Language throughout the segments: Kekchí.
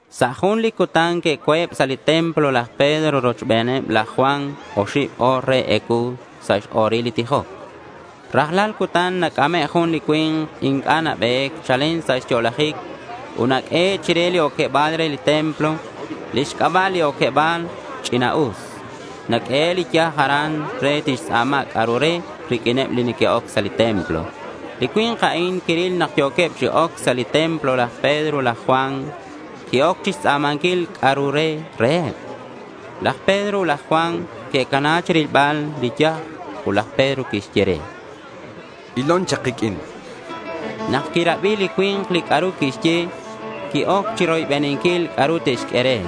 Sa' jun li cutan que'co̱eb sa' li templo laj Pedro rochben laj Juan oxib o̱r re ecuu sa' x-o̱ril li tijoc. Rajlal cutan nac'ame' jun li cui̱nk inc'a' nabe̱c chalen sa' xyo'lajic ut naq'uehe' chire li oqueba̱l re li templo. Lix c'aba' li oqueba̱l a'an “Ch'ina'us”. Naq'uehe' li yaj aran re tixtz'a̱ma c'a'ru re riq'uineb li neque'oc sa' li templo. Li cui̱nk a'in quiril nak yo̱queb chi oc sa' li templo laj Pedro ut laj Juan. Qui-oc chixtz'a̱manquil c'a'ru re reheb. Laj Pedro ut laj Juan que'cana chirilbal li yaj ut laj Pedro quixye re: —Ilon chak kiq'uin.— Nak quirabi li cui̱nk li c'a'ru quixye, qui-oc chiroybeninquil c'a'ru te'xq'ue re.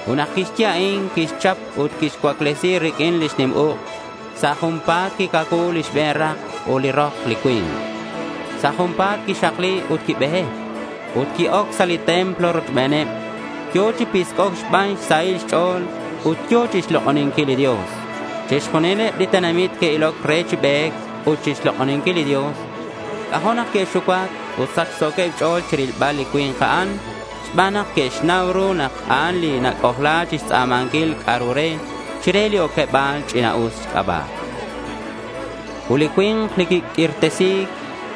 Ut nak quixye a'in, quixchap ut quixcuaclesi riq'uin lix nim uk'. Sa' junpa̱t quicacuu li xbe̱n rak ut li rok li cui̱nk. Sa' junpa̱t quixakli ut quibe̱c. Ut qui-oc sa' li templo rochbeneb. Yo̱ chi pisc'oc xban xsahil xch'o̱l ut yo̱ chixlok'oninquil li Dios. Chixjunileb li tenamit que'iloc re chi be̱c ut chixlok'oninquil li Dios. C'ajo' nak que'xucuac ut sachso̱queb xch'o̱l chirilbal li cui̱nk a'an, xban nak que'xnau ru nak a'an li nac'ojla chixtz'a̱manquil c'a'ru re chire li oqueba̱l “Ch'ina'us” xc'aba'. Ut li cui̱nk li quiq'uirtesi̱c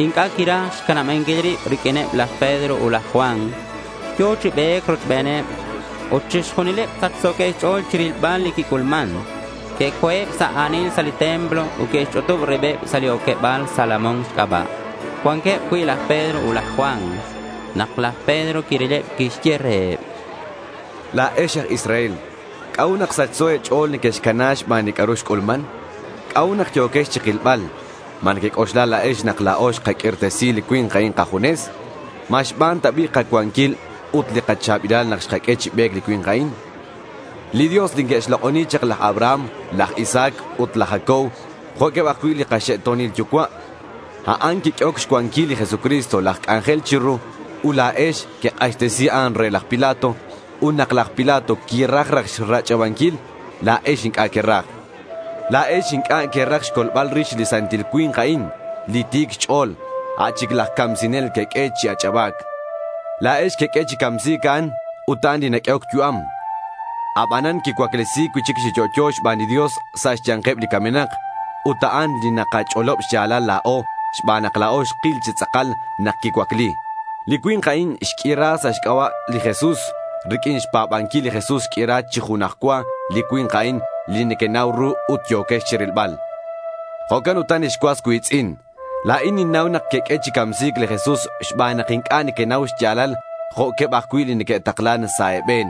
inc'a' quiraj xcanabanquil rib riq'uineb laj Pedro ut laj Juan. Yo̱ chi be̱c rochbeneb. Ut chixjunileb sachso̱queb xch'o̱l chirilbal li quic'ulman. Que'co̱eb sa' a̱nil sa' li templo ut que'xch'utub ribeb sa' li oqueba̱l Salomón xc'aba', cuanqueb cui' laj Pedro ut laj Juan. Nak laj Pedro quirileb, quixye reheb: —La̱ex aj Israel, ¿c'a'ut nak sachso e̱ch'o̱l nequexcana xban li c'a'ru xc'ulman? ¿C'a'ut nak yo̱quex chikilbal? ¿Ma nequec'oxla la̱ex nak la̱o xkaq'uirtesi li cui̱nk a'in kajunes? ¿Ma xban ta bi' kacuanquil ut li kacha̱bilal nak xkaq'ue chi be̱c li cui̱nk a'in? Li Dios li que'xlok'oni chak laj Abraham, laj Isaac ut laj Jacob jo'queb ajcui' li kaxe'to̱nil yucua', a'an quiq'uehoc xcuanquil li Jesucristo laj c'anjel chiru. Ut la̱ex quek'axtesi a'an re laj Pilato. Ut nak laj Pilato quiraj raj rach'abanquil, la̱ex inc'a' queraj. La̱ex inc'a' queraj xcolbal rix li santil cui̱nk a'in, li ti̱c xch'o̱l. A' chic laj camsinel queq'ue chi ach'aba̱c. La̱ex queq'ue chi camsi̱c a'an, ut a'an li naq'uehoc yu'am. Abanan quicuaclesi̱c cui'chic chi yo'yo xban li Dios sa' xya̱nkeb li camenak. Ut a'an li nakach'olob xya̱lal la̱o xban nak la̱o xkil chi tz'akal nak quicuacli. Li cui̱nk a'in xq'uira sa' xc'aba' li Jesús. Riq'uin xpa̱banquil li Jesús xq'uira chi junaj cua li cui̱nk a'in li nequenau ru ut yo̱quex chirilbal. Jo'can ut ex cuas cui̱tz'in, la̱in ninnau nak queq'ue chi camsi̱c li Jesús xban nak inc'a' nequenau xya̱lal jo'queb ajcui' li neque'taklan sa' e̱be̱n.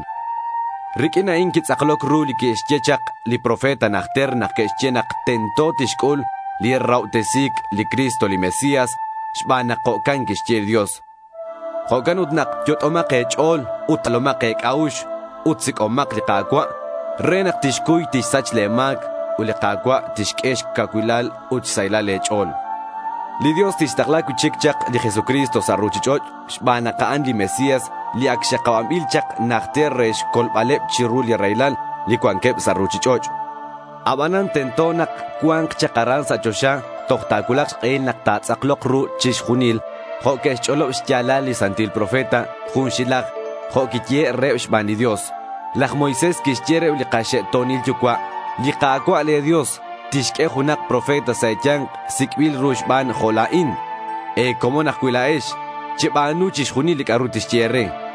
Riq'uin a'in quitz'akloc ru li que'xye chak li profeta najter nak que'xye nak tento tixc'ul li rahobtesi̱c li Cristo li Mesías, xban nak jo'can quixye li Dios. Jo'can ut nak yot'omak e̱ch'o̱l ut jalomak e̱c'a'ux ut sic'omak li Ka̱cua' re nak a'an tixcuy tixsach le̱ ma̱c. Ut li Ka̱cua' tixq'ue xcacuilal ut xsaylal e̱ch'o̱l. Li Dios tixtakla cui'chic chak li Jesucristo sa' ruchich'och' xban nak a'an li Mesías li ac xakabanbil chak najter re xcolbaleb chiru li raylal li cuanqueb sa' ruchich'och'. Abanan tento nak cua̱nk chak aran sa' choxa toj ta̱cuulak xk'ehil nak ta̱tz'aklok ru chixjunil jo' que'xch'olob xya̱lal li santil profeta junxilaj jo' quiyehe' reheb xban li Dios. Laj Moisés quixye reheb li kaxe'to̱nil yucua', “Li Ka̱cua' le̱ Dios tixq'ue junak profeta sa' e̱ya̱nk sic'bil ru xban jo' la̱in. E̱comon ajcui' la̱ex. Cheba̱nu chixjunil li c'a'ru tixye e̱re.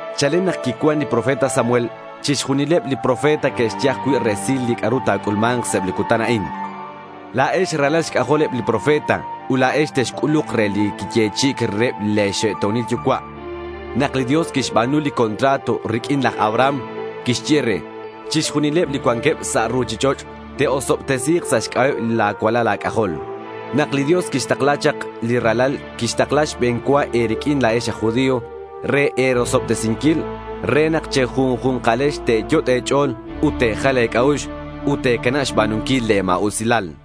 Chalen nak quicuan li profeta Samuel chixjunileb li profeta que'xye ajcui' resil li c'a'ru ta̱c'ulma̱nk sa' eb li cutan a'in. La̱ex ralal xc'ajol eb li profeta ut la̱ex texc'uluk re li quiyechi'i̱c reheb le̱ xe'to̱nil yucua'. Nak li Dios quixba̱nu li contrato riq'uin laj Abraham, quixye re, “Chixjunileb li cuanqueb sa' ruchich'och' te'osobtesi̱k sa' xc'aba'eb la̱ cualal a̱c'ajol.” Nak li Dios quixtakla chak li ralal, quixtakla xbe̱n cua e̱riq'uin la̱ex aj judío re e̱rosobtesinquil re nak che̱junju̱nkalex te̱yot' e̱ch'o̱l ut te̱jal e̱c'a'ux ut te̱canab xba̱nunquil li ma̱usilal.